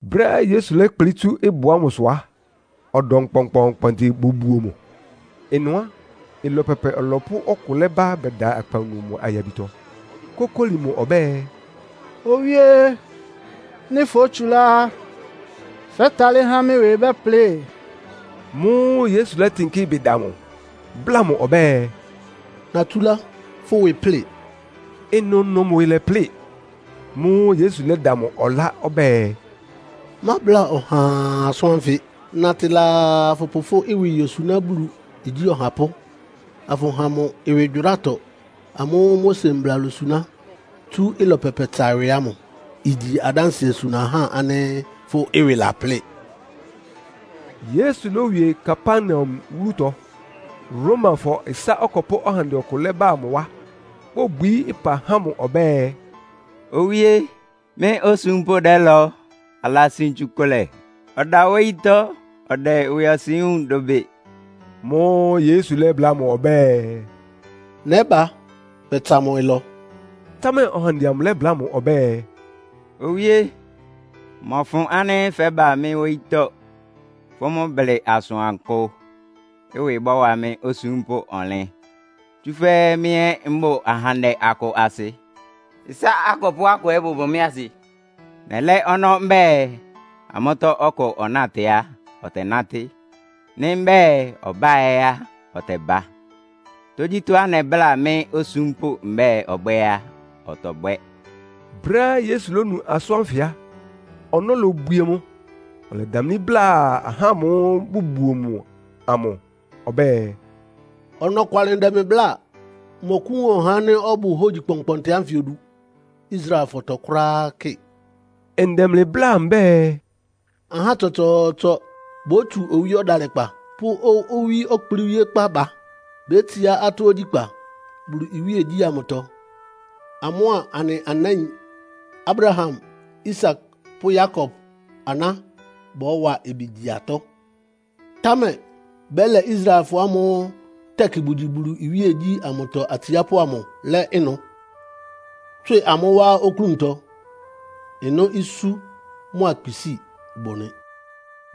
Brɛ́á Yesu lɛ́kplɩ́ tsú ɩbʋ ámʋsʋ á, ɔdɔm kpɔnkpɔɔnkpɔntɩ bobuo mʋ. Ɩnʋ á, ɩlɔ pɛpɛ ɔlɔpʋ́ ɔkʋ lɛ́ba bɛda akpawunu mʋ ayabitɔ, kókóli mʋ ɔbɛ́ɛ, “Owíé! Nɩ́ fótsulá á, fɛ́talɩ́ há mɩ́ ɩwɩ bɛ́plɩ.” Mʋ́ʋ́ Yesu lɛ́tɩnkɩ́ ɩbɩ da mʋ, bláa mʋ ɔbɛ́ɛ, “Natsúlá, fʋ́ ɩwɩ ɩplɩ́ɩ!” Ɩnʋnʋ mʋ ɩwɩ lɛ́plɩ. Mʋ́ʋ́ Yesu lɛ́da mʋ ɔlá ɔbɛ́ɛ, “Mábla ɔhaa asʋ́n ánfɩ. Natɩ laa afʋpʋ fʋ́ ɩwɩ yosuná Bulu igyí ɔhapʋ́, afʋha mʋ ɩwɩgyʋrátɔ amʋ́ʋ́ Mose mbla losuná tsú ɩlɔ pɛpɛtsa ɩwɩ ámʋ. Igyi adánsɩɛ suna ahá ánɩ́ fʋ́ ɩwɩ laplɩ́ɩ.” Yesu lówie Kapernaum wúlutɔ. Romafɔ ɩsá akɔpʋ́ ɔhandɛ ɔkʋ lɛ́ba mʋ wá, bóbwií ɩpa há mʋ ɔbɛ́ɛ, “Owíé, mɩ́ osúmpʋ́ dɛ́lɔ. Alasin tsukʋlɛ, ɔda wóyítɔ́ ɔdɛ ɩwɩɔsɩn wúun dʋbɩ.” Mʋ́ʋ́ Yesu lɛ́bláa mʋ ɔbɛ́ɛ, “Nɛ́ba bɛtsa mʋ ɩlɔ.” Támɛ ɔhandɛ amʋ lɛ́bláa mʋ ɔbɛ́ɛ, “Owíé, mmɔfʋn ánɩ́ fɛ́ba mɩ́ wóyítɔ́. Fʋ́ mʋ́ blɩ asʋankʋ, ɩwɩ bɔ́wa mɩ́ osúmpʋ́ amʋ ɔnlɩn. Tsúfɛ́ mɩ́ ɛ́ mbʋ ahandɛ akʋ asɩ, ɩsá akɔpʋ́ akʋ ɛ́ bʋbʋ mɩ́ asɩ. Nɛlɛ́ ɔnɔ́ mbɛ́ɛ amʋ́tɔ́ ɔkʋ ɔnátɩ á, ɔtɛnátɩ́. Nɩ́ mbɛ́ɛ ɔbá ɛ́ á, ɔtɛba. Tógyítɔ́á nɛbláa mɩ́ osúmpʋ́ mbɛ́ɛ ɔbwɛ́ɛ á, ɔtɔbwɛ́.” Brɛ́á Yesu lónu asʋ́n ánfɩ á, ɔnɔ́ lobwie mʋ, ɔlɛdamlí bláa ahá ámʋ́ʋ́ bʋbuo mʋ amʋ, ɔbɛ́ɛ, “Ɔnɔkwalɩ ndɛ mlɩ bláa, mmɔkʋ́wun ɔhá ánɩ́ ɔbʋ hógyi kpɔnkpɔntɩ ánfɩ odu Israelfɔtɔ kʋ́ráá kɩ!” Ndɛ mlɩ bláa mbɛ́ɛ, “Ahá tsɔtsɔɔtsɔ bótsu owí ɔdalɩkpa pʋ́ owí ɔkplɩ́wíékpá ba, betsiá atɔ́ ogyíkpá Bulu iwíegyí ámʋtɔ, amʋ́a anɩ anáin Abraham, Isak pʋ́ Yakob aná bɔ́wa ɩbɩ gyi atɔ́. Támɛ bɛ́lɛ Israelfɔ ámʋ́ʋ́ tɛkɩ bʋgyi Bulu iwíegyí ámʋtɔ atsiápʋ́ amʋ lɛ́ ɩnʋ, tswɩ amʋ́ wá oklúntɔ. Ɩnʋ́ isú mʋ́a kpisíi bʋ nɩ.”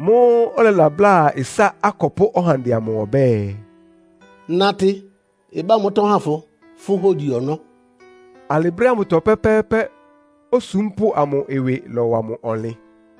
Mʋ́ʋ́ ɔlɛlabláa ɩsá akɔpʋ́ ɔhandɛ amʋ ɔbɛ́ɛ, “Natɩ, ɩbá mʋ́tɔ́ ha fʋ fʋ́ hógyi ɔnɔ́.” Alɩ brɛ́ ámʋtɔ pɛ́pɛ́ɛ́pɛ́ osúmpʋ́ amʋ ɩwɩ lɔ́wa mʋ ɔnlɩn.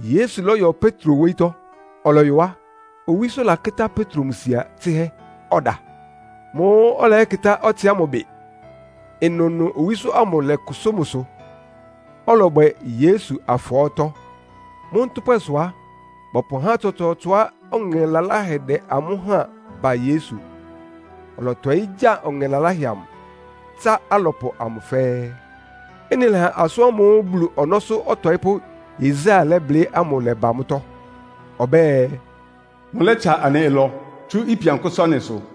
Yesu lɔ́yɔ Petro wóyítɔ́. Ɔlɔyɔ á, owísó lakɩ́tá Petro mʋ sia tsɩ́hɛ́, ɔda. Mʋ́ʋ́ ɔlɛyɛ́kɩtá ɔtsɩ ámʋ ɩbɩ. Ɩnʋnʋ owísó amʋ lɔ́kʋsʋ́ mʋsʋ, ɔlɔbwɛ Yesu afɔɔ́tɔ. Mʋ́ ntʋ́pwɛsʋ á, bɔpʋ ahá tsɔtsɔɔtsɔá ɔŋɛ laláhɛ dɛ́ amʋ́ háan ba Yesu. Ɔlɔtɔɩ́ gya ɔŋɛ laláhɛ amʋ, tsá alɔpʋ amʋ fɛ́ɛ́. Ɩ́nɩ lɛ́ha asʋ́n ámʋ́ʋ́ Bulu ɔnɔ́sʋ́ ɔtɔɩ́pʋ́Yesaia lɛ́blɩ́ ámʋ lɛba mʋ́tɔ́. Ɔbɛ́ɛ, “Mʋlɛ́tsa anɩ ɩlɔ, tsú ipian kʋ́sʋ́ anɩsʋ.”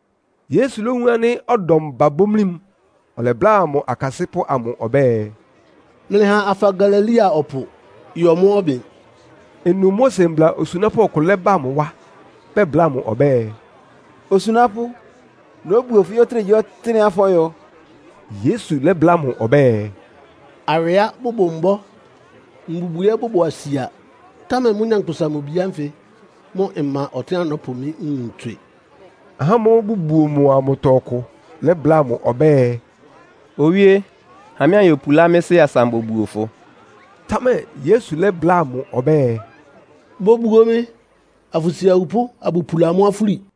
Yesu lówun ánɩ́ ɔdɔm babomlí mʋ, ɔlɛbláa mʋ akasɩ́pʋ́ amʋ ɔbɛ́ɛ, “Mlɩha afa Galilea ɔpʋ yɔ mʋ́ ɔbɩn.” Ɩnʋ Mose mbla osunápʋ́ ɔkʋ lɛ́bá mʋ wá, bɛbláa mʋ ɔbɛ́ɛ, “Osunápʋ́, nóbuo fʋ yɔ́ ɔtɩ́nɛgyíɔtɩ́nɛ́á fɔ́yɔ.” Yesu lɛ́bláa mʋ ɔbɛ́ɛ, “Awɩá bʋbʋ mbɔ́, mbubwi ɛ́ bʋbʋ asia, támɛ mɩ́, Nyankpʋsa-Mʋ-Bi ánfɩ mʋ́ mma ɔtɩ́nɛ́á nɔ́pʋ mɩ́ nwun tswɩ.” Ahá ámʋ́ʋ́ bʋbuo mʋ amʋtɔ ɔkʋ lɛ́bláa mʋ ɔbɛ́ɛ, “Owíé, ha mɩ́ anyopulá mɩ́ sɩ́ asa ambobuo fʋ.” Támɛ Yesu lɛ́bláa mʋ ɔbɛ́ɛ, “Bobuo mɩ, afʋsi awupʋ́ abʋpula amʋ́ afúli.”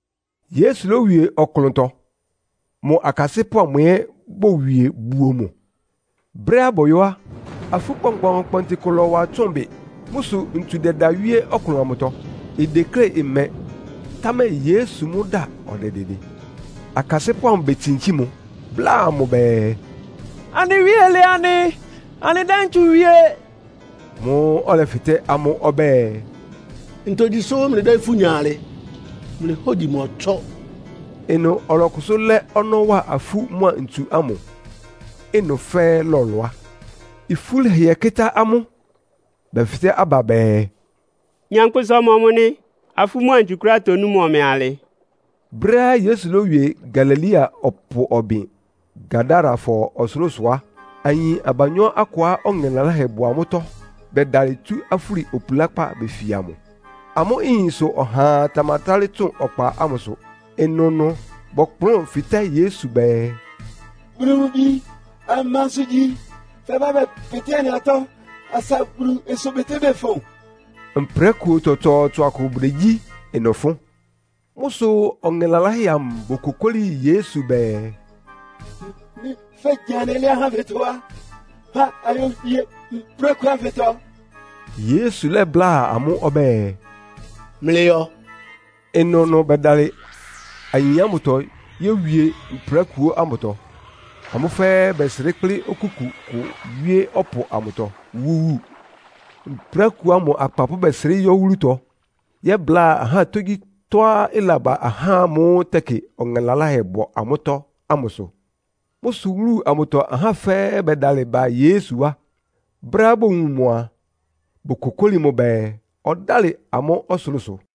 Yesu lówie ɔklʋntɔ, mʋ akasɩ́pʋ́ amʋ ɛ́ bowie buo mʋ. Brɛ́á bɔyɔ́ á, afú kpɔnkpɔɔnkpɔntɩ kʋ lɔ́wa tsʋ́ʋn bɩ. Mʋ́ sʋ ntsu dɛda wíé ɔklʋn amʋtɔ, ideklé ɩmɛ, támɛ Yesu mʋ́ da ɔdɛdɩdɩ. Akasɩ́pʋ́ amʋ betsinkí mʋ, bláa mʋ bɛɛ, “Anɩ Wíe lɛ anɩ. Anɩdɛ́ ntsu wie!” Mʋ́ʋ́ ɔlɛfɩtɛ́ amʋ́ ɔbɛ́ɛ, “Ntogyi sʋ́ mlɩdɛ́ ifú nya alɩ? Mlɩ hógyi mɔtsɔ́!” Ɩnʋ ɔlɔkʋsʋ́ lɛ́ ɔnɔ́ wa afú mʋ́a ntsu ámʋ, ɩnʋ fɛ́ɛ́ lɔlʋá. Ifú lɛhɩɛ kɩ́tá amʋ́, bɛfɩtɛ́ aba bɛɛ, “Nyankpʋsa ɔmɔmʋ nɩ, afú mʋ́a ntsu kʋ́ráá tonú mʋ ɔmɛ alɩ?” Brɛ́á Yesu lówie Galilea ɔpʋ ɔbɩn, Gadarafɔ ɔsʋlʋ́sʋ á, ayin abanyɔ́ akʋá ɔŋɛ laláhɛ bʋ amʋ́tɔ́ bɛdalɩ tsu afúli opulákpá befia mʋ. Amʋ́ ɩyɩn sʋ ɔhaa tamatálɩ́ tsʋn ɔkpa ámʋsʋ. Ɩnʋnʋ bɔkplʋ́n fɩtɛ́ Yesu bɛɛ, “Bulu mʋ Bi, amansʋ igyi? Fɛbá bɛpɩtɩ́ anɩ atɔ́ asa Bulu ɩsʋbɩtɩ́bɩ ɩfʋn?” Mprákuo tsɔtsɔɔtsɔ akʋ bʋdegyí ɩnʋ fʋ́n. Mʋ́ sʋ ɔŋɛ laláhɛ amʋ bokokóli Yesu bɛɛ, “Nɩ́ fégya anɩ lɛ́ ahá ánfɩtɔ á, ha ayowie mprákuo ánfɩtɔ.” Yesu lɛ́bláa amʋ́ ɔbɛ́ɛ, “Mlɩyɔ.” Ɩnʋnʋ bɛdalɩ ayin ámʋtɔ yówie mprákuo ámʋtɔ. Amʋ́ fɛ́ɛ́ bɛsrɩ́ kplɩ́ okúku kʋ wíé ɔpʋ amʋtɔ, wúwu. Mprákuo ámʋ akpapʋ́ bɛsrɩ́ yɔ́ wúlutɔ, yɛ́bláa ahá tógyítɔ́á ɩlaba ahá ámʋ́ʋ́ tɛkɩ ɔŋɛ laláhɛ bʋ amʋ́tɔ́ ámʋsʋ. Mʋ́ sʋ wúlu amʋtɔ ahá fɛ́ɛ́ bɛdalɩ ba Yesu wá. Brɛ́á bowun mʋ a, bokokóli mʋ bɛɛ, ɔdálɩ amʋ́ ɔsʋlʋ́sʋ.